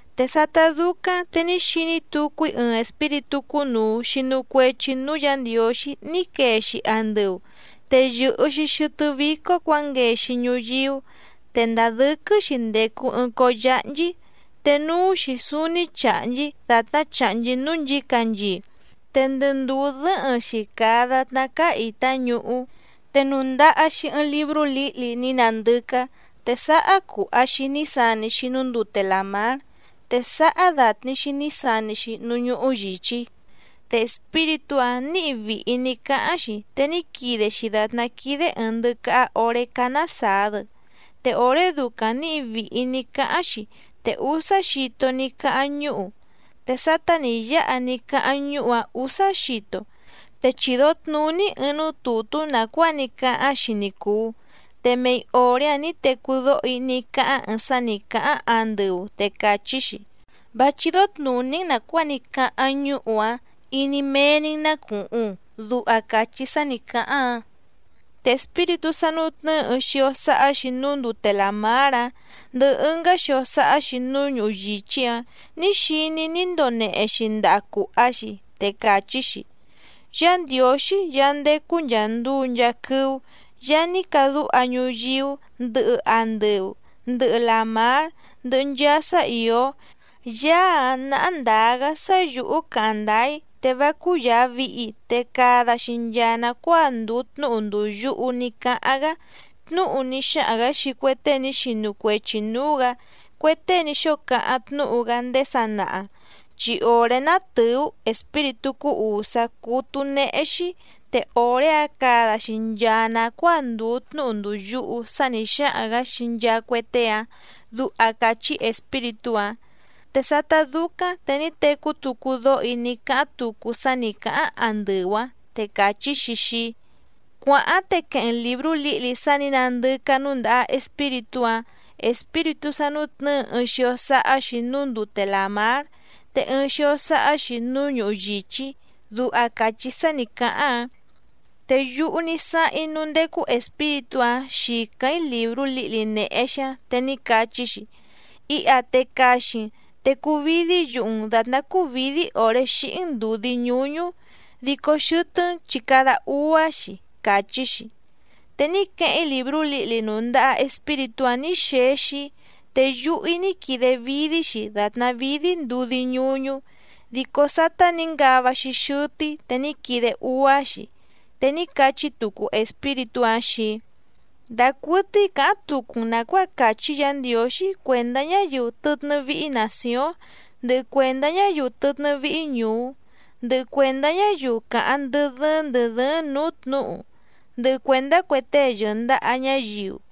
Te sátá dúcáⁿ te ní xiní tucu‑í ɨɨⁿ espíritú cúnùu xinu cuechi núú Yǎ Ndiǒxí ní quee‑xi andɨu, te yɨ̀hɨ‑xi xɨtɨ́ vícó cuǎnguee‑xi ñuyíú te ndàa dɨ́quɨ́‑xi ndècu ɨɨⁿ cóó yáhnchí, te núú‑xi súúní chàhnchí dàtná chàhnchí núú nchǐcanchii, te ndɨ ndùú dɨ́hɨⁿ‑xi càa datná cáá ìtá ñuhú. Te nùndaha‑xi ɨɨⁿ librú lǐhli ní nandɨcá, te sáhá cùha‑xi ní sani‑xi núú ndute làmár, te sáhá dàtni‑xi ní sani‑xi núú ñuhu yìchí. Te espíritú‑áⁿ nǐhi vìhi ní cáháⁿ‑xi, te ní quide‑xi dàtná quídé ɨ̀ɨⁿ ndɨcaha oré cánásàa‑dɨ, te òré ducaⁿ nǐhi vìhi ní cáháⁿ‑xi te úsá xito ní cáháⁿ ñúhu. Te sátá nǐ yáha ní cáháⁿ ñúhu‑áⁿ ǔsá xito, te chido tnùní‑í ɨɨⁿ núú tùtú nàcuáa ní cáháⁿ‑xi ni cùu, te mei òré‑áⁿ nǐ tecú dóho‑í ní cáháⁿ ɨɨⁿ sá nǐ cáháⁿ andɨu te càchí‑xi: —Vá chídó tnùní‑n nàcuáa ní cáháⁿ ñúhu‑áⁿ, iní méé‑ní‑n ná cùhuⁿ —duha càchí sá nǐ cáháⁿ‑áⁿ. Te espíritú sá nútnɨ̌ɨ ɨɨⁿ xio sáhá‑xi núú ndute làmár‑áⁿ ndɨhɨ ɨngá xio sáhá‑xi núú ñuhu yìchí‑áⁿ nǐ xiní‑í ní ndonehe‑xi ndaha cùha‑xi, te càchí‑xi: —Yá Ndiǒxí Yaá ndécú nchàa nduu nchaa quɨ́ú Yaá ní cadúha ñuyíú, ndɨhɨ andɨu, ndɨhɨ làmár, ndɨhɨ nchaa sá ìó, Yaá‑áⁿ náhá ndǎá‑gá sá yǔhú càháⁿ ndáá‑í, te vá cúyàa vihi te cada‑xi nchaa nàcuáa ndùu tnúhu ndùu yuhu ní cáháⁿ‑gá, tnúhu ní xáhaⁿ‑gǎ xii cue tée ní xinu cuechi nǔú‑gǎ, cue tée ní xóo cáháⁿ tnúhu‑gá ndéé sanaha, chi òré ná tɨ̀ú espíritú cúú ùsá cútú néhé‑xí, te òré‑áⁿ cada‑xi nchaa nàcuáa ndùu tnúhu ndùu yuhu sá nǐ xáhaⁿ‑gǎ xii nchaa cue tée‑áⁿ —duha càchí espíritú‑áⁿ. Te sátá dúcáⁿ te ní tecú tucu dóho‑í ní cáháⁿ tucu sá nǐ cáháⁿ andɨu‑áⁿ, te càchí‑xi xii‑í: —Cuàháⁿ te queheⁿ‑n lìbrú lǐhli sá nǐ nàndɨcá núndàha espíritú‑ǎⁿ, espíritú sá nútnɨ̌ɨ ɨɨⁿ xio sáhá‑xi núú ndute làmár, te ɨɨⁿ xio sáhá‑xi núú ñuhu yìchí —duha càchí sá nǐ cáháⁿ‑áⁿ. Te yúhú ní sáháⁿ‑í núú ndécú espíritú‑áⁿ xìcáⁿ‑í lìbrú lǐhli nèhe‑xi‑áⁿ, te ní cachí‑xi: —Iha te caxi‑n, te cuvídí yuhu‑n dàtná cúvǐdí òré xíhí‑n ndùdí ñúñú, dico xɨtɨ́‑n chi cada úá‑xi —càchí‑xi. Te ní queheⁿ‑í lìbrú lǐhli nùndaha espíritú‑áⁿ nǐ xexi‑í, te yuhu‑í ní quide vídí‑xi dàtná vídí ndudí ñúñú, dico sátá nǐ ngava‑xi xɨtɨ́‑í te ní quide úá‑xi. Te ní cachí tucu espíritú‑áⁿ xii‑í: —Dacuɨtɨ́í cǎháⁿ tucu‑n nàcuáa càchí Yǎ Ndiǒxí cuèndá ñáyiu tɨtnɨ́ víhí nàcióⁿ, ndɨhɨ cuèndá ñáyiu tɨtnɨ́ víhí ñùú, ndɨhɨ cuèndá ñáyiu càháⁿ ndɨ́ dɨ́ɨ́ⁿ ndɨ̀ dɨ́ɨ́ⁿ nǔú tnǔhu, ndɨhɨ cuèndá cue tée yɨ̀ndaha ñáyiu.